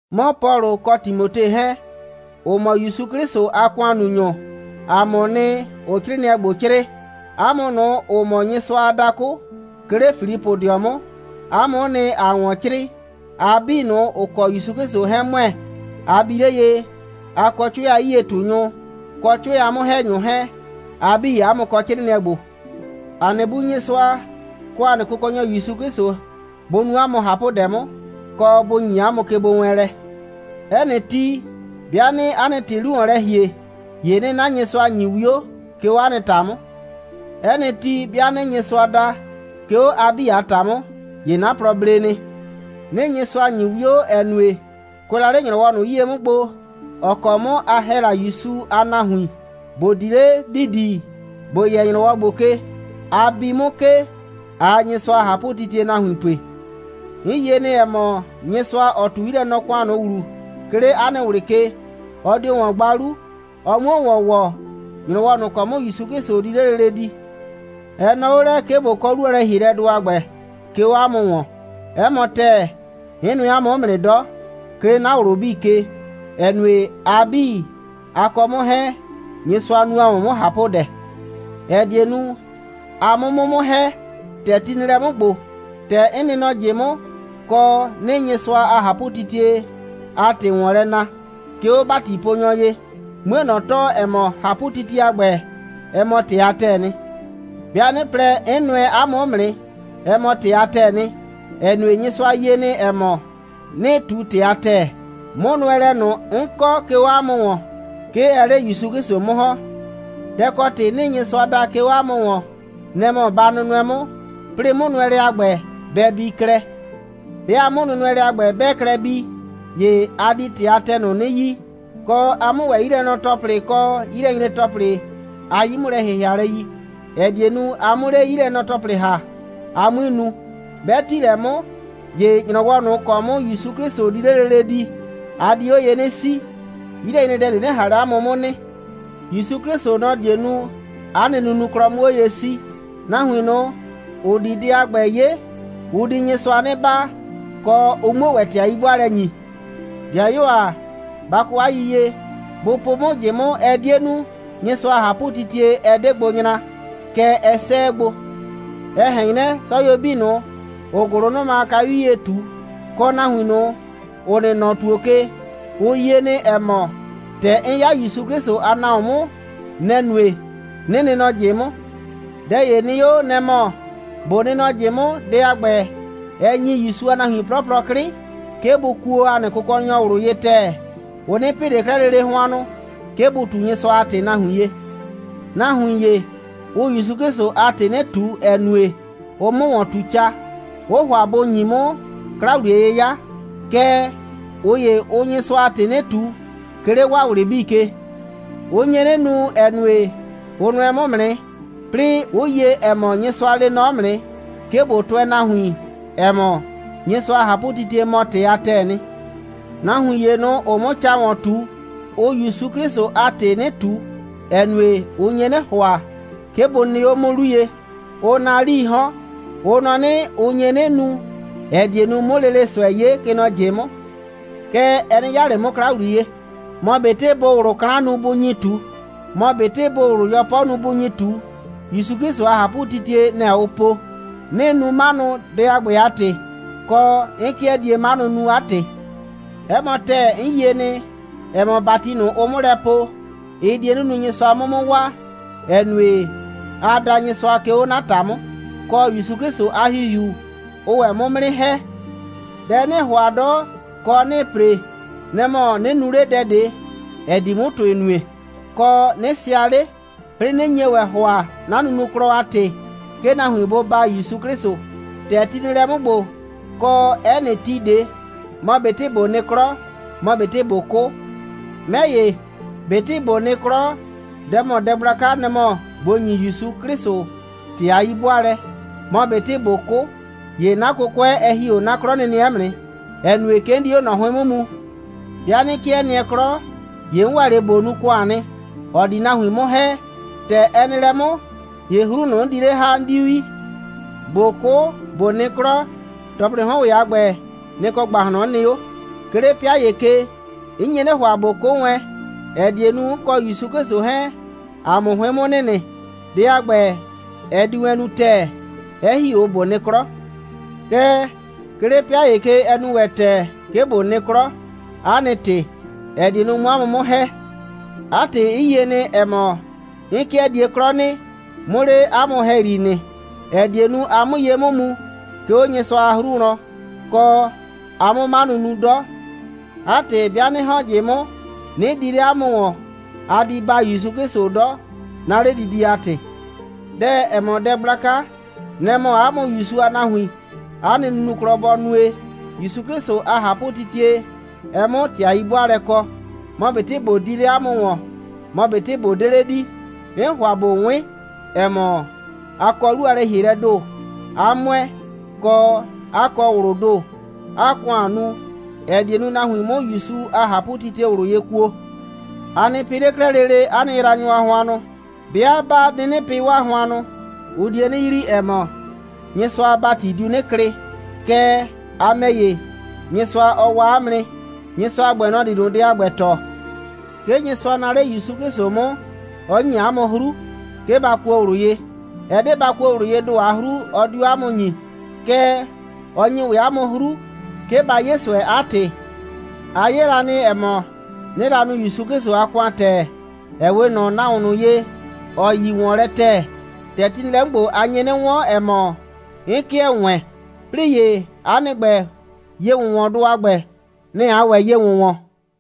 'Mɔ Pɔlʋ kɔ Timote 'hɛɛn, ‑ʋ mɔ ‑Yusu 'Klɩsʋ a ‑kʋannunyʋ, ‑a mʋʋ nɩ, ‑ʋʋ 'crɩɩnɩɛ ‑gbo 'crɩɩ. 'A mʋ ꞊nʋ, ‑ʋ mɔ Nyɩsʋa a dakʋ, 'ke 'le Filipʋdɩɔ 'mʋ, 'a mʋ'ʋ nɩ, ‑aa ‑wɔn 'crɩɩ, a 'bii ꞊nʋ, ‑ʋ kɔ ‑Yusu 'Klɩsʋ 'hɛɛn ‑mʋɛ. A bi 'le ye, a kɔ 'cʋɛ a 'yie꞊tunyʋ, kɔ 'cʋɛ a 'mʋ‑hɛnyʋ 'hɛɛn, a 'bii, 'a mʋ kɔ 'crɩɩnɩɛ ‑gbo. ‑A nɩ Bu Nyɩsʋa, kɔ ‑a nɩ Kʋkɔnyɔ ‑Yusu 'Klɩsʋ, bʋ nu 'a mʋ ꞊hapʋdɛ 'mʋ, kɔ bʋ ‑nyi 'a mʋ kegbowɛɛnlɛ. 'Ɛ nɩ ti, 'bɩa 'nɩɩ 'a nɩ ‑tɩ 'lu ‑wɔn lɛ ‑hie, ‑ye 'nɩɩ 'na Nyɩsʋa ‑nyi 'wio, 'ke 'o 'a nɩ ‑ta 'mʋ. 'Ɛ nɩ ti, 'bɩa 'nɩɩ Nyɩsʋa da, 'ke 'o a 'bii ‑ta 'mʋ, ‑ye 'na plɔ ble nɩ. 'Nɩɩ Nyɩsʋa ‑nyi 'wio, ‑ɛ nue, kʋɛ la 'le ‑nyrɔwɔ ꞊nʋ 'yie 'mʋ gbo, ‑ɔ kɔ 'mʋ a ‑hɛ la ‑Yusu a nahuin, ‑bo di 'le ‑didi, ‑bo yɛ ‑nyrɔwɔ ‑gbo ke, a bi 'mʋ ke, ꞊aa Nyɩsʋa a ꞊hapʋtitie nahuin pue. 'N yie nɩ, ‑ɛ mɔ, Nyɩsʋa, ‑ɔ ꞊tu 'yilɛnɔ‑kʋan ꞊nʋ ‑wlu, 'ke 'le 'a nɩ ꞊wlɩ ke, ɔ dio ‑wɔn gba 'lu, ɔ 'muo ‑wɔn ‑wɔ ‑nyrɔwɔ ꞊nʋ ‑kɔ 'mʋ ‑Yusu 'Klɩsʋ di 'le lele di. Ɛ nɔɔ 'o lɛ, 'ke ꞊bo kɔ 'lu a lɛ‑hielɛdʋ a ‑gbɛ, 'ke 'o 'a mʋ ‑wɔn. 'Ɛ mɔ ‑tɛɛ, 'n nʋɛ 'a mʋ 'mʋ nɩ 'dɔ, 'ke 'le 'na ꞊wlʋ 'bii ke, ‑ɛ nue, a 'bii, a kɔ 'mʋ 'hɛɛn, Nyɩsʋa nu ‑a mʋ 'mʋ ꞊hapʋdɛ, ‑ɛ die nu, a 'mʋ 'mʋ 'mʋ ‑hɛ, ‑tɛ ti nɩ lɛ 'mʋ ‑gbo, ‑tɛ 'n nɩ nɔ ꞊jɩ 'mʋ, kɔ, 'nɩɩ Nyɩsʋa a ꞊hapʋtitie a ‑tɩ ‑wɔn lɛ na, 'ke 'o ‑batiponyɔ ye, 'mue ꞊nɔ tɔɔ, ‑ɛ mɔ, ꞊hapʋtitie a ‑gbɛ, ɛ mɔ ‑tɩ a ‑tɛɛ nɩ. 'Bɩa 'nɩ plɛ, 'n nʋɛ 'a mʋ 'mʋ nɩ, ɛ mɔ ‑tɩ a ‑tɛɛ nɩ, ‑ɛ nue, Nyɩsʋa yie nɩ, ‑ɛ mɔ, 'nɩɩ ꞊tu ‑tɩ a ‑tɛɛ. 'Mʋnʋɛlɛ ꞊nʋ, 'n kɔ, 'ke 'o 'a mʋ ‑wɔn, 'ke ɛɛ 'le ‑Yusu 'Klɩsʋ 'mʋ ‑hɔn. Dɛ ‑kɔ ‑tɩ 'nɩɩ Nyɩsʋa da, 'ke 'o 'a mʋ ‑wɔn, nɛ‑ mɔ ba nʋnʋɛ 'mʋ, 'plɩɩ 'mʋnʋnʋɛlɛ a ‑gbɛ bɛ bii klɛ. 'Bɩa 'mʋnʋnʋɛlɛ a ‑gbɛ, 'bɛɛ klɛ bii, ‑ye a di ‑tɩ a ‑tɛɛ ꞊nʋ 'nɩ yi, kɔ, a 'mʋ ‑wɛ 'yilɛnɔ‑tɔplɩ kɔ 'yilɛnyre‑tɔplɩ a 'yi'mʋlɛ‑hɩhɩalɛ yi, ‑ɛ die nu, a 'mʋ 'le 'yilɛnɔ‑tɔplɩ ‑ha, a 'mui nu. 'Bɛ ‑ti lɛ 'mʋ, ‑ye ‑nyrɔwɔ ꞊nʋ ‑kɔ 'mʋ ‑Yusu 'Klɩsʋ di 'le lele di, a di 'o ye 'nɩ 'sii, 'yilɛnyredɛ ꞊de 'nɩ ꞊han 'le 'a mʋ 'mʋ nɩ. ‑Yusu 'Klɩsʋ, nɔ‑ die nu, 'a nɩ nunuklɔ 'mʋ 'o ye 'sii. Nahuin ꞊nʋ, ‑ʋ di dɛ a ‑gbɛ 'ye, ʋ di Nyɩsʋa 'nɩ baa, kɔ, ʋ 'muo ‑wɛ ‑tɩ a 'yi'bʋaalɛ ‑nyi. 'Dɩayuo ‑a, ba kɔ 'a yiyie, bʋ po 'mʋ ꞊jɩ 'mʋ, ɛ 'die nu, Nyɩsʋa a ꞊hapʋtitie 'ɛ 'de gbo nyra, kɛɛ, ɛ 'sɛɛ gbo. Ɛ ꞊hɛn 'nyrɛ, 'sɔyuo 'bii ꞊nʋ, ‑ʋʋ ‑gʋlʋnʋma a kayu 'yie ꞊tu, kɔ nahuin ꞊nʋ, ‑ʋ nɩ nɔ ‑tuo ke, ʋ yie nɩ, ‑ɛ mɔ, ‑tɛ 'n 'ya ‑Yusu 'Klɩsʋ a nahuon 'mʋ, nɛ‑ nue, 'nɩ nɩ nɔ ꞊jɩ 'mʋ. Dɛ ‑ye nɩ 'o, nɛ‑ mɔ ꞊bo nɩ nɔ ꞊jɩ 'mʋ, dɛ a ‑gbɛ, ɛ ‑nyi ‑Yusu a nahuin 'plɔplɔ 'klɩ, 'ke bʋ kuo ‑a nɩ Kʋkɔnyɔ ꞊wlʋ ye ‑tɛɛ. Ʋ 'nɩ pɩ ꞊le 'klɛɛ lele hʋannʋ, 'ke bʋ ꞊tu Nyɩsʋa a ‑tɩ nahuin ye. Nahuin ‑ye, ʋʋ ‑Yusu 'Klɩsʋ a ‑tɩ 'nɩ ꞊tu, ‑ɛ nue, ʋʋ 'mʋ ‑wɔn ꞊tu ca. Ʋʋ ‑hʋa bʋ ‑nyi 'mʋ 'kla‑wliye'yɩya. Kɛɛ, ꞊ʋ ‑ye, ʋʋ Nyɩsʋa a ‑tɩ 'nɩ ꞊tu, 'ke 'le 'waa ꞊wlɩ 'bii ke. Ʋ nye 'nɩ nu, ‑ɛ nue, ʋ nʋɛ 'mʋ 'mʋ nɩ, 'plɩɩ 'ʋ yie, ‑ɛ mɔ, Nyɩsʋa lee nɔ 'mʋ nɩ, 'ke ꞊bo tʋɛ nahuin, ‑ɛ mɔ, Nyɩsʋa a ꞊hapʋtitie mɔ ‑tɩ a ‑tɛɛ nɩ. Nahuin ‑ye ꞊nʋ, ‑ʋʋ 'mʋ ca ‑wɔn ꞊tu, ʋʋ ‑Yusu 'Klɩsʋ a ‑tɩ 'nɩ ꞊tu, ‑ɛ nue, ʋ nye 'nɩ ‑hʋa, 'ke bʋ nɩ 'o 'mʋ 'lu ye. Ʋʋ naa 'lii 'hɔn. Ʋ nɔ 'nɩ, ʋ nye 'nɩ nu, ‑ɛ die nu, 'mʋ lele ꞊sʋɛ 'ye, kɛ nɔ ꞊jɩ 'mʋ. Kɛɛ, ɛ 'nɩ 'yaa ꞊le 'mʋ 'kla ‑wliye. Mɔ ꞊betɩ bʋʋ ꞊wlʋ 'klan nu, bʋ nyi ꞊tu, mɔ ꞊betɩ bʋʋ ꞊wlʋ 'yɔpɔ nu, bʋ nyi ꞊tu, ‑Yusu 'Klɩsʋ a ꞊hapʋtitie, nɛ‑ ʋʋ po. 'Nɩɩ nu 'manʋ, dɛ a ‑gbɛ a ‑tɩ, kɔ, 'n 'kɩɛ die 'manʋ nu, 'a ‑tɩ. 'Ɛ mɔ ‑tɛɛ, 'n yie nɩ, ‑ɛ mɔ, ‑bati ꞊nʋ, ʋʋ 'mʋ lɛ poo, ɩ die 'nɩ nu, Nyɩsʋa 'mʋ 'mʋ waa, ‑ɛ nue, aa da Nyɩsʋa, 'ke 'o 'na ‑ta 'mʋ, kɔ ‑Yusu 'Klɩsʋ a ‑Hihiu, ʋʋ ‑wɛ 'mʋ 'mʋ 'nɩ ‑hɛ. Dɛ 'nɩɩ ‑hʋa 'dɔ, kɔ, 'nɩɩ ‑pre, nɛ‑ mɔ, 'nɩ nu 'le dɛ ꞊de, ‑ɛ di 'mʋ ‑tʋɩ nue, kɔ, 'nɩ sɩa 'le, 'plɩɩ 'nɩ nye ‑wɛ ‑hʋa, 'na nunuklɔ a ‑tɩ, 'ke nahuin bʋ baa ‑Yusu 'Klɩsʋ, ‑tɛ ti nɩ lɛ 'mʋ ‑gbo, kɔ 'ɛ nɩ ti ꞊de, mɔ ꞊betɩ ꞊bo nɩ 'klɔ, mɔ ꞊betɩ ꞊bo 'kʋ. 'Mɛ ‑ye, ꞊betɩ ꞊bo nɩ 'klɔ, dɛ ‑mɔ dɛ gblaka, nɛ‑ mɔ ꞊bo ‑nyi ‑Yusu 'Klɩsʋ ‑tɩ a 'yi'bʋaalɛ, mɔ ꞊betɩ ꞊bo 'kʋ, ‑ye 'na 'kʋkʋɛ, ɛ ‑hi 'o 'na 'klɔnɩnɩɛ 'mʋ nɩ, ‑ɛ nue, 'ke 'n di 'o ꞊nɔ 'hʋɩn 'mʋ mu. 'Bɩa 'nɩ 'kɩɛ nɩɛ 'klɔ, ‑ye 'n ‑wɛ 'le ꞊bo nu ‑kʋan nɩ, ‑ɔ di nahuin 'mʋ ‑hɛ. ‑Tɛ ɛ nɩ lɛ 'mʋ, ‑ye 'hru ꞊nʋ, 'n di 'le ‑ha, 'n 'diu yi. ꞊Bo 'kʋ, ꞊bo nɩ 'klɔ, ‑tɔplɩɩ 'hɔn ‑wɛ a ‑gbɛ, nɩ‑ kɔ ‑gbahlɔn 'n nɩ 'o. 'Ke 'le 'pɩa ‑ye ke, 'n nye 'nɩ ‑hʋa, ꞊bo 'kʋ wɛn, ‑ɛ die nu, 'n kɔ ‑Yusu 'Klɩsʋ 'hɛɛn, ‑a 'mʋ 'hʋɩn 'mʋ nɩnɩ. Dɛ a ‑gbɛ, ɛ di wɛn nu ‑tɛɛ, 'ɛ ‑hi 'o ꞊bo nɩ 'klɔ. Kɛɛ, 'ke 'le 'pɩa ‑ye ke, ɛ nu ‑wɛ ‑tɛɛ, 'ke ꞊bo nɩ 'klɔ, 'a nɩ ‑tɩ, ‑ɛ die nu, 'mʋ 'a mʋ 'mʋ ‑hɛ. 'A ‑tɩ, 'n yie nɩ, ‑ɛ mɔ, 'n 'kɩɛ die 'klɔ nɩ, 'mʋ 'le 'a mʋ ‑hɛyri nɩ, ‑ɛ die nu, a 'mʋ ye 'mʋ mu, 'ke 'o Nyɩsʋa a 'hru wlɔn, kɔ, a 'mʋ 'manʋ nu 'dɔ. 'A ‑tɩ, 'bɩa 'nɩ ‑hɔn nɔ ꞊jɩ 'mʋ, 'nɩ di 'le 'a mʋ ‑wɔn, a di baa ‑Yusu 'Klɩsʋ 'dɔ, 'na 'ledidie a ‑tɩ. Dɛ, ‑ɛ mɔ dɛ gblaka, nɛ‑ mɔ 'a mʋ ‑Yusu a nahuin, 'a nɩ nunuklɔ bɔ nue, ‑Yusu 'Klɩsʋ a ꞊hapʋtitie, ɛ 'mʋ ‑tɩ a 'yi'bʋaalɛ kɔ. Mɔ ꞊betɩ ꞊bo di 'le 'a mʋ ‑wɔn, mɔ ꞊betɩ ꞊bo 'de 'le di, 'n ‑hʋa ꞊bo 'wɩn, ‑ɛ mɔ, a kɔ 'lu a lɛ‑hielɛɛ ‑do, 'a ‑mʋɛ, kɔ, 'a kɔ ꞊wlʋʋ ‑do, 'aa ‑kʋan nu, ‑ɛ die nu, nahuin 'mʋ ‑Yusu a ꞊hapʋtitie ꞊wlʋ ye kuo. A nɩ pɩ 'le 'klɛɛ lele 'a nɩ yraanyʋ a hʋannʋ. 'Bɩa 'ba 'nɩnɩ pɩ 'waa hʋannʋ, ʋ die 'nɩ yrii, ‑ɛ mɔ, Nyɩsʋa a ‑bati diu 'nɩ klɩ, kɛɛ, a ‑mɛ ‑ye, Nyɩsʋa, ɔ waa 'a mʋ nɩ. Nyɩsʋa a ‑gbɛ, nɔ‑ di ꞊nʋ dɛ a ‑gbɛ tɔɔ. 'Ke Nyɩsʋa naa 'le ‑Yusu 'Klɩsʋ 'mʋ, 'ɔ ‑nyi 'a mʋ 'hru, 'ke ba kuo ꞊wlʋ ye. Ɛ 'de ba kuo ꞊wlʋ yee ‑do a 'hru, ɔ 'diu 'a mʋ ‑nyi, kɛɛ, ɔ ‑nyi ‑wɛ 'a mʋ 'hru, 'ke ba 'ye ꞊sʋɛ, 'a ‑tɩ. A 'ye la nɩ, ‑ɛ mɔ, 'nɩɩ la nu ‑Yusu 'Klɩsʋ a ‑kʋan ‑tɛɛ, ‑ɛ 'we ꞊nɔ nahuon ꞊nʋ ye, ‑ɔ yi ‑wɔnlɛ ‑tɛɛ. ‑Tɛ ti nɩ lɛ 'mʋ ‑gbo, a nye 'nɩ 'wɔn, ‑ɛ mɔ, 'n 'kɩɛ ‑wɛɛn. 'Plɩɩ ‑ye, 'a nɩ ‑gbɛ, ye‑wʋnwɔndʋ a ‑gbɛ, nɛ‑ aa ‑wɛ ye ‑wʋnwɔn.